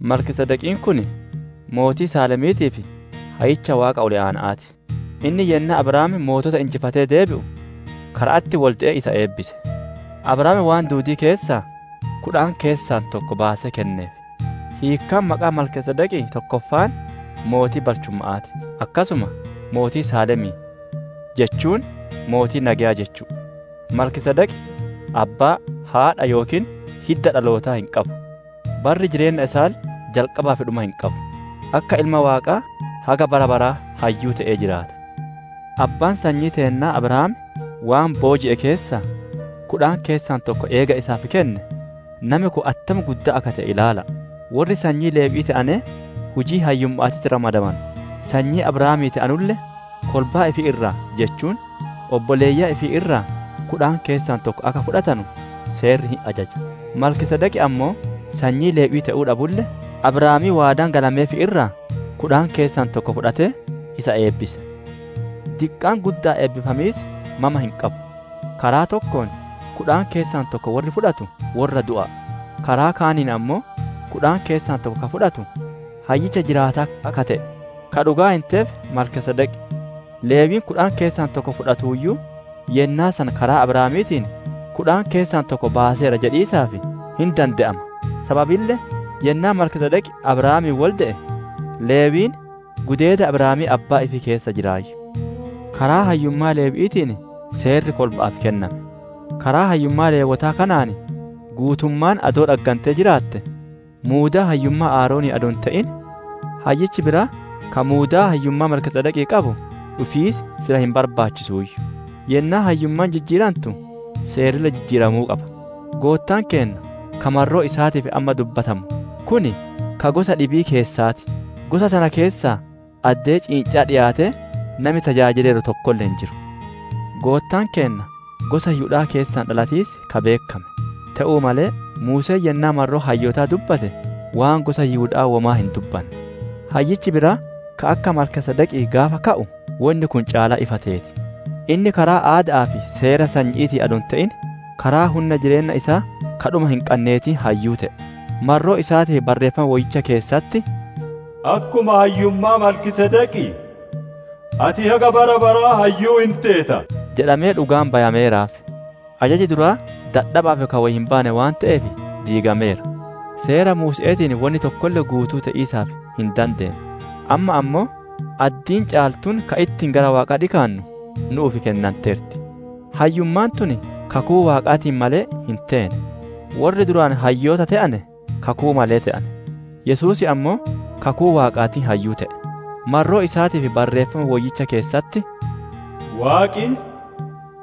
Malkiisedeqiin kun mootii Saalemiitii fi hayyicha Waaqa Ol Aana'aa ti; inni yennaa Abrahaam mootota injifatee deebi'u kara'atti wolde'ee isa eebbise. Abrahaam waan duudii keessaa, kudhan keessaa tokko baasee kenneef; hiikkaan maqaa Malkiisedeqii tokkeessoon, «Mootii balchumma'aa ti», akkasuma «Mootii Saalemii» jechuun «Mootii nageyaa» jechu'u. Malkiisedeq abbaa, haadha, yookiin hidda dhalootaa hin qabu; barri jireenna isaalle jalqabaa fi dhuma hin qabu; akka Ilma Waaqaa haga bara baraa hayyuu te'ee jiraata. Abbaan sanyii teennaa Abrahaam waan booji'e keessaa, kudhan keessaa tokko eega isaaf kenne, nami kun attam guddaa akka te'e ilaala'a! Worri sanyii Lewwi'ii te'anee hujii hayyumma'aatitti ramadamanu, sanyii Abrahaamii te'anulle kolbaa ifii irraa jechuun obboleeyyan ifii irraa kudhan keessaa tokko akka fudhatanu seerrii hin ajaja. Malkiisedeq ammoo sanyii Lewwi'ii te'uu dhabulle, Abrahaamii waadaan galameef irraa kudhan keessaa tokko fudhatee, isa eebbise. Diqqaan gudda'aan eebbifamiis mama hin qabu. Karaa tokkoon kudhan keessaa tokko worri fudhatu worra du'a'a; karaa kaaniin ammoo kudhan keessaa tokko ka fudhatu, hayyicha jiraataa akka te'e ka dhugaan hinteef Malkiisedeq. Lewwiin kudhan keessaa tokko fuudhuuyyu, yennaa san karaa Abrahaamiitiin, «Kudhan keessaa tokko baaseera» jedhiisaaf hin dande'ama. Sababille yennaa Malkiisedeq Abrahaamiin wolde'e, Lewwiin gudeeda Abrahaamii abbaa ifii keessa jiraayyu. Karaa hayyummaa Lewwi'iitiin seerri kolba'aaf kenname; karaa hayyummaa Lewwootaa kanaan guutummaan adoo dhaggantee jiraatte, muudaa hayyummaa Aaronii adoo hin te'in, hayyichi biraa ka muudaa hayyummaa Malkiisedeqii qabu dhufiis sila hin barbaachisuuyyu. Yennaa hayyummaan jijjiirantu seerrille jijjiiramuu qaba. Goottaan keenna ka marroo isaatiif amma dubbatamu kun ka gosa dhibii keessaa ti; gosa tana keessaa addee ciinca'aa dhiyaatee nami tajaajileeru tokkolle hin jiru. Goottaan keenna gosa Yihuda'aa keessaa dhalatiis ka beekkame; te'uu malee Muuseen yennaa marroo hayyootaa dubbate, waan gosa Yihuda'aa womaa hin dubbanne. Hayyichi biraa ka akka Malkiisedeqii gaafa ka'u, wonni kun caalaa ifa teeti. Inni karaa aada'aa fi seera sanyi'iitiin adoo hin te'in, karaa hunna jireenna isaa ka dhuma hin qanneetiin hayyuu te'e. Marroo isaatiif barreeffama Woyyicha keessatti, «Akkuma hayyummaa Malkiisedeqii, ati haga bara baraa hayyuu hin teeta» jedhamee dhugaan bayameeraaf. Ajaji duraa dadhaba'aa fi ka wo hin baane waan te'eef diigameera. Seera Muuse'eetiin wonni tokkolle guutuu te'iisaaf hin dandeenne; amma ammoo addiin caaltuun ta ittiin gara Waaqaa dhikaannu nu'uuf kennanteerti. Hayyummaan tun kakuu Waaqaatiin malee hin teene; worri duraan hayyoota te'ane kakuu malee te'ane. Yesuus ammoo kakuu Waaqaatiin hayyuu te'e; marroo isaatiif Barreeffama Woyyicha keessatti, «Waaqi,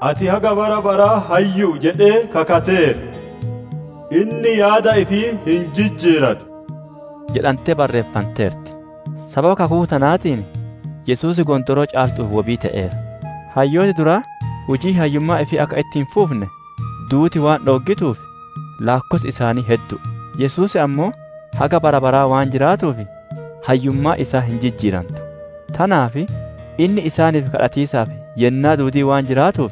‹Ati haga bara baraa hayyu'u› jedhee kakateera, inni yaada ifii hin jijjiiratu» jedhantee barreeffanteerti. Sababa kakuu tanaatiin Yesuus gondooroo caaltu'uuf wobii te'eera. Hayyooti duraa hujii hayyummaa ifii akka itti hin fufne duuti waan dhooggituuf, laakkossi isaanii heddu'u. Yesuus ammoo haga bara baraa waan jiraatuuf, hayyummaan isaa hin jijjiirantu. Tanaaf inni isaaniif gaafatiisaaf yennaa duudii waan jiraatuuf,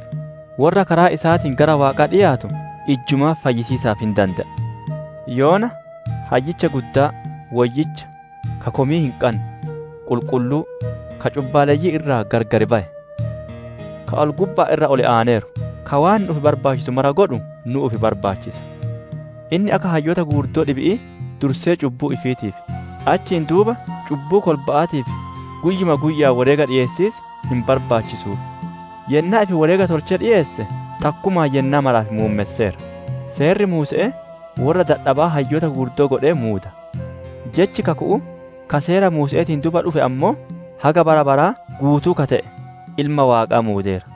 worra karaa isaatiin gara Waaqaa dhiyaatu ijjumaa fayyisiisaaf hin dande'a. Yoona Hayyicha Guddaa: Woyyicha, ka komii hin qanne, qulqulluu, ka cubbaalleyyii irraa gargar baye, ka ol-gubba'aan irra ol aaneeru ka waan nu'uuf barbaachisu mara godhu nu'uuf barbaachisa. Inni akka hayyoota gugurdoo dhibi'i, dursee cubbuu ifiitiif, achiin duuba cubbuu kolba'aatiif guyyuma guyya'aan woreega dhiyeessiis hin barbaachisuuf; yennaa ifi woreega tolchee dhikeesse, takkumaan yennaa maraaf muummesseera. Seerri Muuse'ee worra dadhabaa hayyoota gugurdoo godhee muuda; jechi kaku'uu ka Seera Muuse'eetiin duuba dhufe ammoo, haga bara baraa guutuu ka te'e Ilma Waaqaa muudeera.